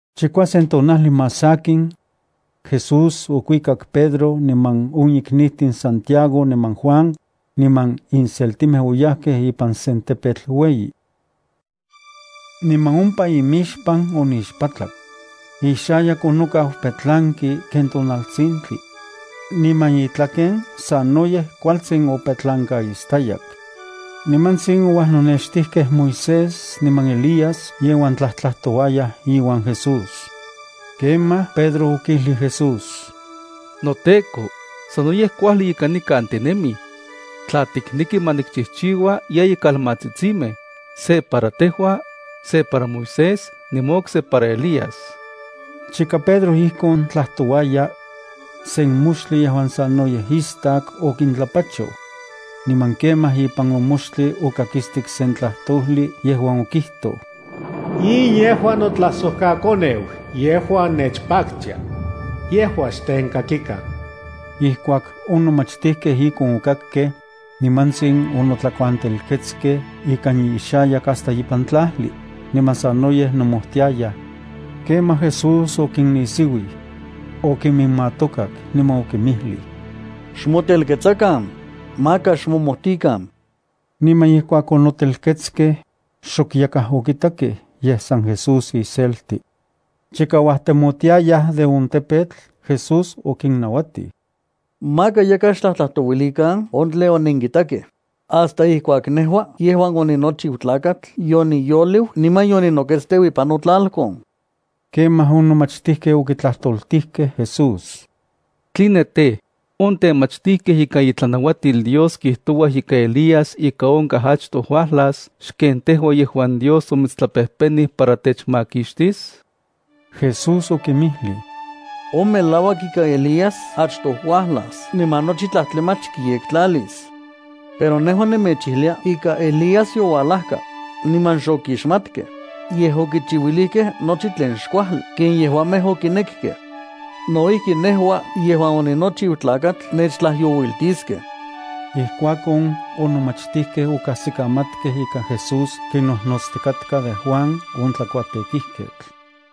Chikuasen tonajli más sakin, Jesús okuikak Pedro niman on iknijtin Santiago niman Juan, niman inseltimej oyajkej ipan sen tepetl ueyi. Niman ompa imixpan onixpatlak. Ixayak onokau petlanki ken tonaltsintli, niman itlaken sanoyej kualtsin opetlankaistayak. Nimatsin ouajnonextijkej Moisés niman Elías yejuan tlajtlajtojuayaj iuan Jesús. Kemaj Pedro okijlij Jesús: —NoTEKO, ¡sanoyej kuajli ika nikan tinemij! Tla tikneki, ma nikchijchiua yeyi kalmatsitsimej, se para tejua, se para Moisés niman okse para Elías. Chika Pedro ijkon tlajtouaya, sen moxtli yejuan sanoyej istak okintlapachoj. Niman kemaj ipan on moxtli okakistik sen tlajtojli yejuan okijtoj: —In yejua notlajsojkaKoneu yejuan nechpaktia. Yejua xtenkakikan. Ijkuak on nomachtijkej ijkon okakkej, nimantsin onotlakuantelketskej ikan inxayak hasta ipan tlajli, niman sanoyej nomojtiayaj. Kemaj Jesús okinnisiuij, okinminmatokak, niman okinmijlij: —Xmotelketsakan, maka xmomojtikan. Niman ijkuak onotelketskej, xok yakaj okitakej, yej san Jesús iselti. Chika uajtemotiayaj de on tepetl, Jesús okinnauatij: —Maka yakaj xtlajtlajtouilikan on tlen onenkitakej, hasta ijkuak nejua yejuan oninochiu Tlakatl yoniyoliu niman yoninoketsteu ipan notlalkon. Kemaj on nomachtijkej okitlajtoltijkej Jesús: —¿Tline tej, on temachtijkej ikan itlanauatil Dios kijtouaj ika Elías ika onkaj achtoj uajlas xken tejua yejuan Dios omitstlapejpenij para techmakixtis? Jesús okinmijlij: —On melauak ika Elías achtoj uajlas niman nochi tlajtlamach kiyektlalis. Pero nejua nemechijlia ika Elías youajlaka, niman xokixmatkej, yej okichiuilijkej nochi tlen xkuajli ken yejuamej okinekkej. No ijki nejua yejuan oninochiu Tlakatl nechtlajyouiltiskej. Ijkuakon, on nomachtijkej okajsikamatkej ika Jesús kinnojnotstikatka de Juan on tlakuatekijketl.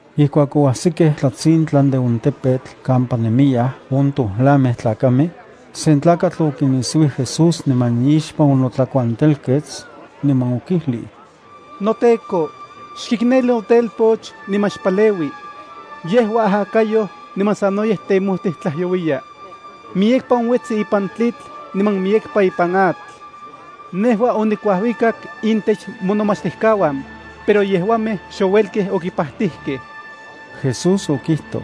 Ijkuak oajsikej tlatsintlan de on tepetl kampa nemiyaj on tojlamej tlakamej, sen tlakatl okinisiuij Jesús niman ixpan onotlakuantelkets, niman okijlij: —NoTEKO, xkikneli notelpoch niman xpaleui. Yejua ajakayoj niman sanoyej temojtij tlajyouiya. Miyekpa onuetsi ipan tlitl niman miyekpa ipan atl. Nejua onikuajuikak intech monomachtijkauan, pero yejuamej xouelkej okipajtijkej. Jesús okijtoj: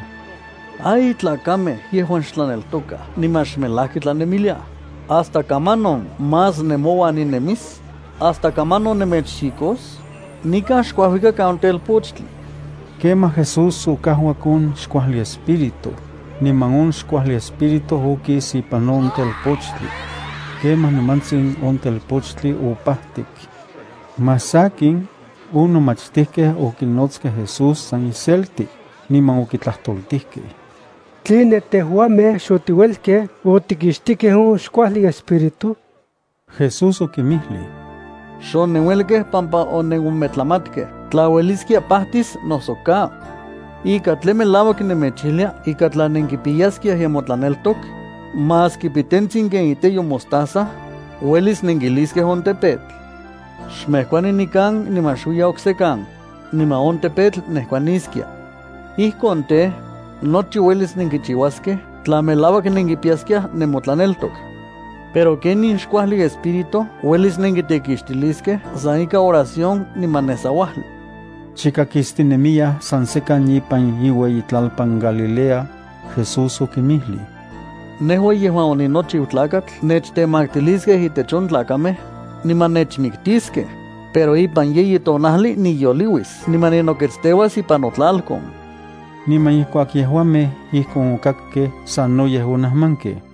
—¡Ay, tlakamej yejuan xtlaneltokaj niman xmelajki tlanemiliaj! ¿Hasta kamanon más nemouan ninemis? ¿Hasta kamanon nemechxikos? Nikan xkuajuikakan on telpochtli. Kemaj Jesús okajuak on xkuajli espíritu, niman on xkuajli espíritu okis ipan on telpochtli. Kemaj nimantsin on telpochtli opajtik. Más sakin, on nomachtijkej okinotskej Jesús san iselti, niman okitlajtoltijkej: —¿Tline tejuamej xotiuelkej otikixtijkej on xkuajli espíritu? Jesús okinmijlij: —Xonenuelkej pampa onenometlamatkej tla ueliskia pajtis noso ka. Ika tlen melauak nemechijlia ika tla nenkipiyaj nemotlaneltok, maski pitentsin ken iteyo mostaza, uelis nenkijliskej on tepetl: “Xmejkuani nikan niman xuiya oksekan”, niman on tepetl nejkuaniskia. Ijkon tej, nochi uelis nenkichiuaskej tla melauak nenkipiyaskiaj nemotlaneltok. Pero ken in xkuajli espíritu uelis nenkitekixtiliskej san ikan oración niman nesauajli. Chika kistinemiyaj san sekan ipan iueyitlalpan Galilea, Jesús okinmijlij: —Nejua yejuan oninochiu Tlakatl nechtemaktiliskej intech on tlakamej, niman nechmiktiskej, pero ipan yeyi tonajli niyoliuis niman ninoketsteuas ipan notlalkon. Niman ijkuak yejuamej ijkon okakkej, sanoyej onajmankej.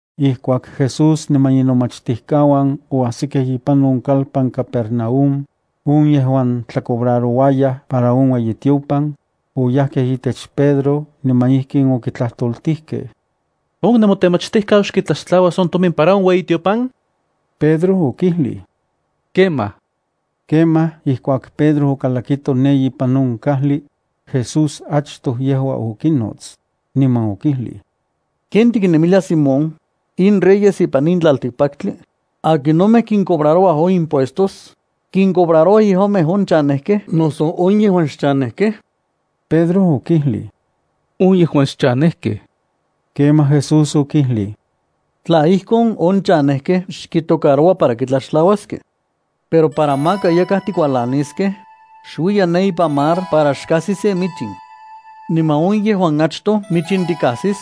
Ijkuak Jesús niman inomachtijkauan oajsikej ipan on kalpan Capernaúm, on yejuan tlacobrarouayaj para on ueyitiopan, oyajkej itech Pedro niman ijkin okitlajtoltijkej: —¿On nemotemachtijkau xkitlaxtlauas on tomin para on ueyitiopan? Pedro okijlij: —Kemaj. Kemaj ijkuak Pedro okalakito ne ipan on kajli, Jesús achtoj yejua okinots, niman okijlij: —¿Ken tiknemilia Simón? In reyes ipan in tlaltikpaktli, ¿akinomej kincobrarouaj on impuestos? ¿Kincobrarouaj yejuamej on chanejkej noso on yejuan xchanejkej? Pedro okijlij: —On yejuan xchanejkej. Kemaj Jesús okijlij: —Tla ijkon, on chanejkej xkitocaroua para kitlaxtlauaskej. Pero para maka yakaj tikualaniskej, xuiya ne ipan mar para xkajsi sen michin. Niman on yejuan achtoj michin tikajsis,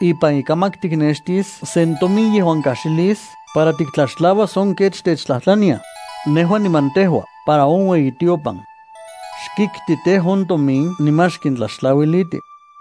ipan ikamak tiknextis sen tomin yejuan kajxilis para tiktlaxtlauas on kech techtlajtlaniaj nejua niman tejua para on ueyitiopan. Xkikti tej, on tomin niman xkintlaxtlauiliti.